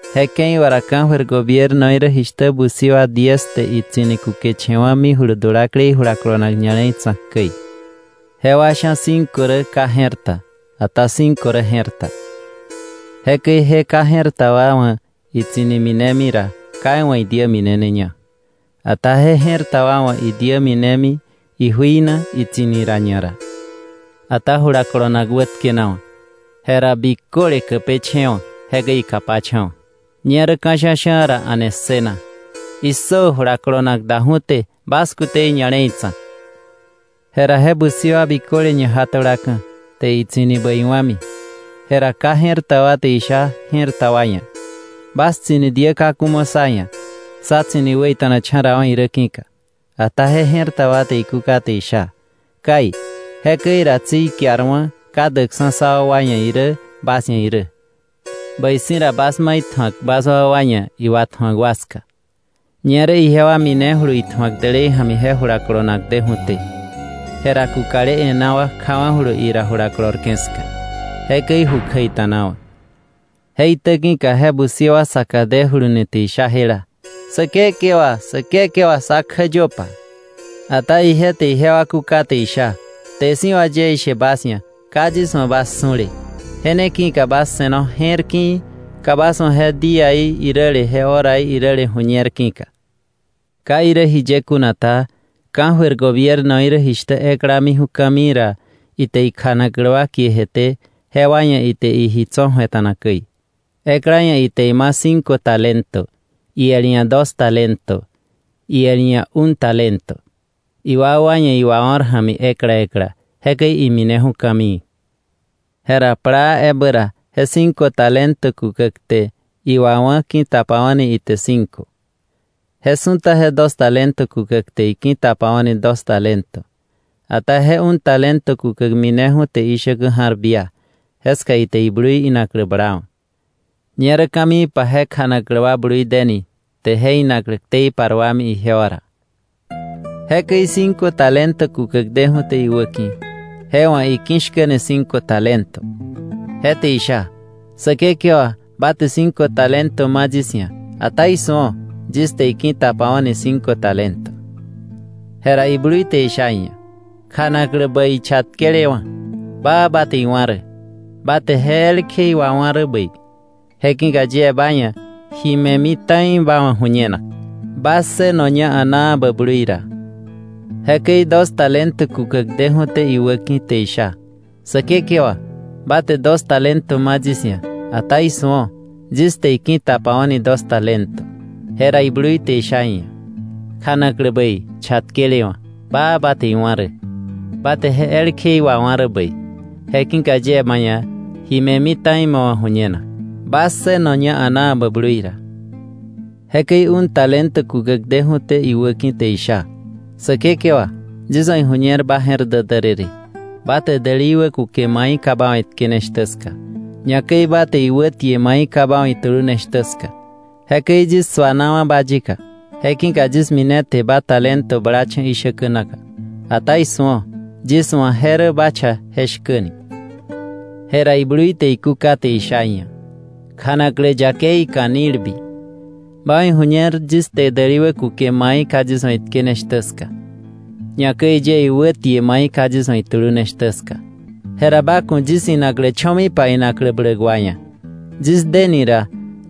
“Je ke̱i wà ra ka̱jöir gobiernoí rä jishtä busi wa diez te itsi̱ni kukeche̱wa̱ mijulu dulaklei jula kolonak ña̱le̱i tsa̱k käi. Jewa sha̱ cinco rä ka je̱r ta, ata cinco rä je̱r ta. Jekäi je ka je̱r ta wa wa̱ tsi̱ni minemi ra, ka iwa̱ idiä mineneña. Ata je je̱r ta wa wa̱ idiä mine ijui na itsi̱ni ra ñara. Ata jula kolonak wätkenawa̱. Jera biköle käpeche̱e̱wa̱, jekäi ikapacha̱wa̱. Ñerä ka̱ sha̱sha̱ ra, a̱ne ssëna: ‘¡Issö! Jula kolonak daju̱té; bas kute je ña̱le̱i tsa̱k.’ Jera je busi wa biköle ñaja tulaka̱, te itsi̱ni bäi wa̱mi. Jera ka je̱r ta wa te isha je̱r ta wa ia̱: ‘Bas tsi̱ni diä kaku mo sá ia̱, sá tsi̱ni wäita̱nacha̱rawa̱ irä ki̱ka.’ Ata je je̱r ta wa te ikúka te isha: ‘Kai, jekäi ra tsi ikiarwa̱ ka däkksa̱ sá wakwa ia̱ irä bas ia̱ irä. Bäi si̱ ra bas ma itju̱ak bas wakwa ia̱ iwatju̱ak wa ska.’ Ñerä ijewa minejulu itju̱ak dälei ja̱mi je jula kolonak deju̱té. Jera kukale e̱ná wa kjawa̱julu ira jula kolorke̱ ska, jekäi ju kjäita̱nawa̱. Je itäki̱ka je busi wa saka dejuluni te isha jela: ‘Säkekewa, Säkekewa, sá kjäyöpa.’ Ata ije te ijewa kúka te isha: ‘Kte si̱ wà yie ishe bas ia̱, ka yis wa̱ bas su̱le.’ “Je ne ki̱ka bas se̱no je̱r ki̱i̱, ka bas wa̱ je díaí iräle je horaí iräle ju̱ñer ki̱ka. “Ka irä jiye kuna ta, ka̱jöir gobiernoí rä jishtä ekla miju̱ ka̱mii ra ite ikjanaklä wa kie jeté, jewa ia̱ ite iji tso̱ ju̱eta̱na käi; ekla ia̱ ite ima̱ cinco talento, iel ia̱ dos talento, iel ia̱ un talento, iwakwa ia̱ iwao̱r ja̱mi ekla ekla. Jekäi imineju̱ ka̱mii. Jera plaa ebä ra, je cinco talento kukäk te iwawá̱, ki̱tapawa̱ni ite cinco. Je su̱ta je dos talento kukäk te iki̱tapawa̱ni dos talento. Ata je un talento kukäk mineju̱ te ishäkä ja̱r bia, jeska ite iblui inaklä blawa̱. “Ñerä ka̱miipa je kjanaklä wa blui deni, te je inaklä ktei paruami ijewa ra. Jekäi cinco talento kukäk deju̱té iwäki̱, je wa̱ iki̱shkäni cinco talento. Je te isha: ‘Säkekewa, ba te cinco talento ma yis ia̱, ata ¡isu̱o! Yis te iki̱tapawa̱ni cinco talento.’ Jera iblui te isha iia̱: ‘Kjanaklä bäi chatkelewa̱, baa ba te iwá̱ rä. Ba te ji elkje wawá̱ rä bäi, je ki̱ka yie ba ia̱ ji me̱mi ta̱i ma wa̱ ju̱ñenak. Ba ssënoña a̱naa bä blui ra.’ Jekäi dos talento kukäk deju̱té iwäki̱ te isha: ‘Säkekewa, ba te dos talento ma yis ia̱, ata ¡isu̱o! Yis te iki̱tapawa̱ni dos talento.’ Jera iblui te isha iia̱: ‘Kjanaklä bäi, chatkelewa̱; baa ba te iwá̱ rä. Ba te ji elkje wawá̱ rä bäi, je ki̱ka yie ba ia̱ ji me̱mi ta̱i ma wa̱ ju̱ñenak. Ba ssënoña a̱naa bä blui ra. “Jekäi un talento kukäk deju̱té iwäki̱, te isha: ‘Säkekewa, yis wa̱ iju̱ñer ba je̱r dä därërë; ba te däli wä kuke mai ka ba wa̱ itkene shtä ska, ñakäi ba te iwä tie mai ka ba wa̱ itulune shtä ska. Jekäi yis suanawa̱ ba yika, je ki̱ka yis mine te ba talento blacha̱ ishäkä naka, ata ¡isu̱o! Yis wa̱ je rä ba cha je shkäni.’ Jera iblui te ikúka te isha iia̱: ‘Kjanaklä yakei, ka̱nilbi; ba wa̱ iju̱ñer yis te däli wäkuke mai ka yis wa̱ itkene shtä ska, ñakäi yie iwä tie mai ka yis wa̱ itulune shtä ska, jera ba ku̱ yis inaklä cho̱mipa inaklä bläk wa ia̱, yis deni ra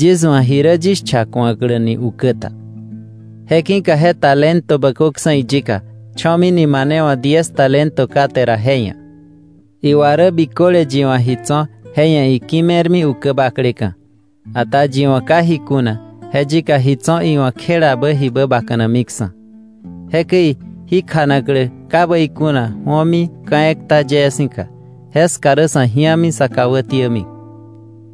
yis wa̱ ji rä yis cha ku̱akläni ukä ta.’ Je ki̱ka je talento bököksa̱ iyika, cho̱mini mane wa̱ diez talento kate ra je ia̱. Iwa rä biköle yi wa̱ ji tso̱ je ia̱ iki̱me̱rmi ukä bakleka̱; ata yi wa̱ ka ji kuna, je yika ji tso̱ iwa̱ kjelabä jibä bakanamiksa̱. Jekäi jí kjanaklä ka bäi kuna ju̱omi ka̱ ekta yee si̱ka, jeska rä sa̱ ji̱ami, sä kà wätiämi.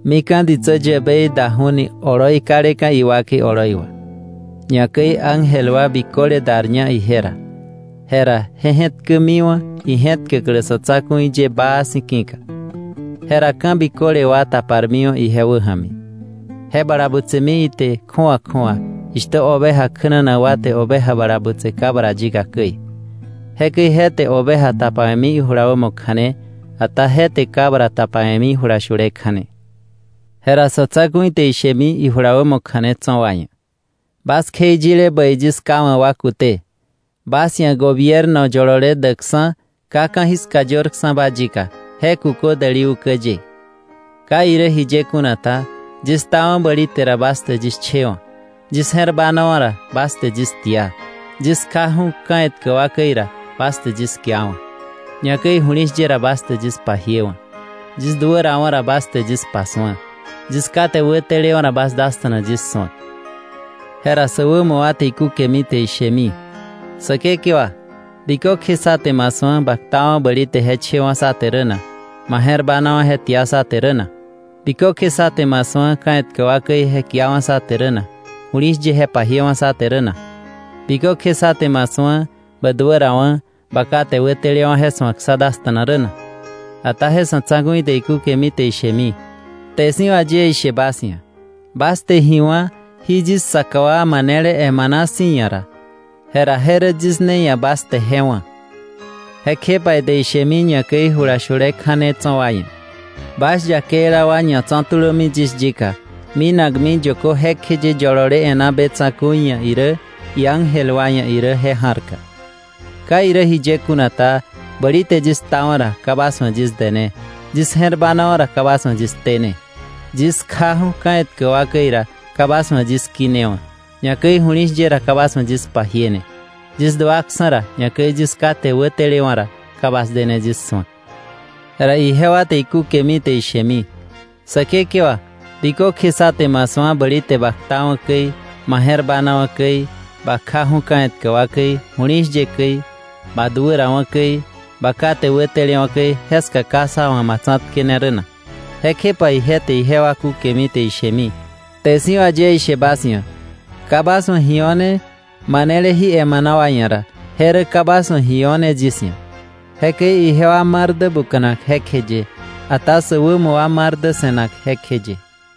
“Mika̱ ditsä yäbei daju̱ni oloi kaleka̱ iwakei oloi wà, ñakäi ángel wa biköle darña ije ra, jera je je̱tkämiwa̱ ije̱tkäklä sa̱ tsa̱ku̱i ye baa si̱ ki̱ka. Jera ka̱ biköle wa taparmiwa̱ ije wäja̱mi, je bala butsemi ite kju̱awa kju̱awa, jishtä oveja kjänanak wa te oveja bala butse cabra yika käi. Jekäi je te oveja tapawe̱mi ijula wämo kja̱ne, ata je te cabra tapawe̱mi jula shule kja̱ne. Jera Sa̱tsa̱ku̱i te ishemi ijula wämo kja̱ne tso̱ wa ia̱: ‘Bas kjeiyile bäi yis Ká wa̱ wa kute, bas ia̱ gobierno yolole däkksa̱ ka ka̱jiska yörksa̱ba yika, je kukö däli ukä ye. Ka irä jiye kuna ta, yis ktawa̱ bäli te ra, bas te yis chewa̱; yis je̱r banawa̱ ra, bas te yis tia; yis kjaju̱ ka̱ etkä wa käi ra, bas te yis kiawa̱; ñakäi ju̱li̱shye ra, bas te yis pajiewa̱; yis duärawa̱ ra, bas te yis pasu̱a; yis kate wätelewa̱ ra, bas dasta̱na yis su̱ak.’ Jera sä wämo wa te ikúkemi te ishemi: ‘Säkekewa, ¿bikökje sá te ma su̱a ba ktawa̱ bäli te je chewa̱ sá te rä na, ma je̱r banawa̱ je tia sá te rä na? ¿Bikökje sá te ma su̱a ka̱ etkä wa käi je kiawa̱ sá te rä na, ju̱li̱shye je pajiewa̱ sá te rä na? ¿Bikökje sá te ma su̱a ba duärawa̱, bä kate wätelewa̱, je su̱ak sá dasta̱na rä na?’ Ata je Sa̱tsa̱ku̱i te ikúkemi te ishemi: ‘Kte si̱ wà yie ishe bas ia̱, bas te ji wá̱ jí yis saka wa manele emana si̱ ia̱ ra, jera je rä yis ne ia̱ bas te je wá̱.’ “Jekjepa ite ishemi ñakäi jula shule kja̱ne tso̱ wa ia̱: ‘Bas yakeila wa ñatso̱ tulömi yis yika minakmi yökö jekjeye yolole e̱ná be tsa̱ku̱i ia̱ irä, iángel wa ia̱ irä, je ja̱rka. Ka irä jiye kuna ta, bäli te yis ktawa̱ ra, ka bas wa̱ yis dené; yis je̱r banawa̱ ra, ka bas wa̱ yis tene; yis kjaju̱ ka̱ etkä wa käi ra, ka bas wa̱ yis kinewa̱; ñakäi ju̱li̱shye ra, ka bas wa̱ yis pajiene; yis duaksa̱ ra, ñakäi yis kate wätelewa̱ ra, ka bas dene yis su̱ak.’ Jera ijewa te ikúkemi te ishemi: ‘Säkekewa, ¿bikökje sá te ma su̱a bäli te ba ktawa̱ käi, ma je̱r banawa̱ käi, ba kjaju̱ ka̱ etkä wa käi, ju̱li̱shye käi, ba duärawa̱ käi, ba kate wätelewa̱ käi, jeska ka sá wa̱ ma tsa̱tkene rä na?’ Jekjepa ije te ijewa kúkemi te ishemi: ‘Kte si̱ wà yie ishe bas ia̱, ka bas wa̱ ji o̱ne manele jí emana wa ia̱ ra, je rä ka bas wa̱ ji o̱ne yis ia̱. Jekäi ijewa mar dä buka̱nak jekjeye, ata sä wämo wa mar dä se̱nak jekjeye.”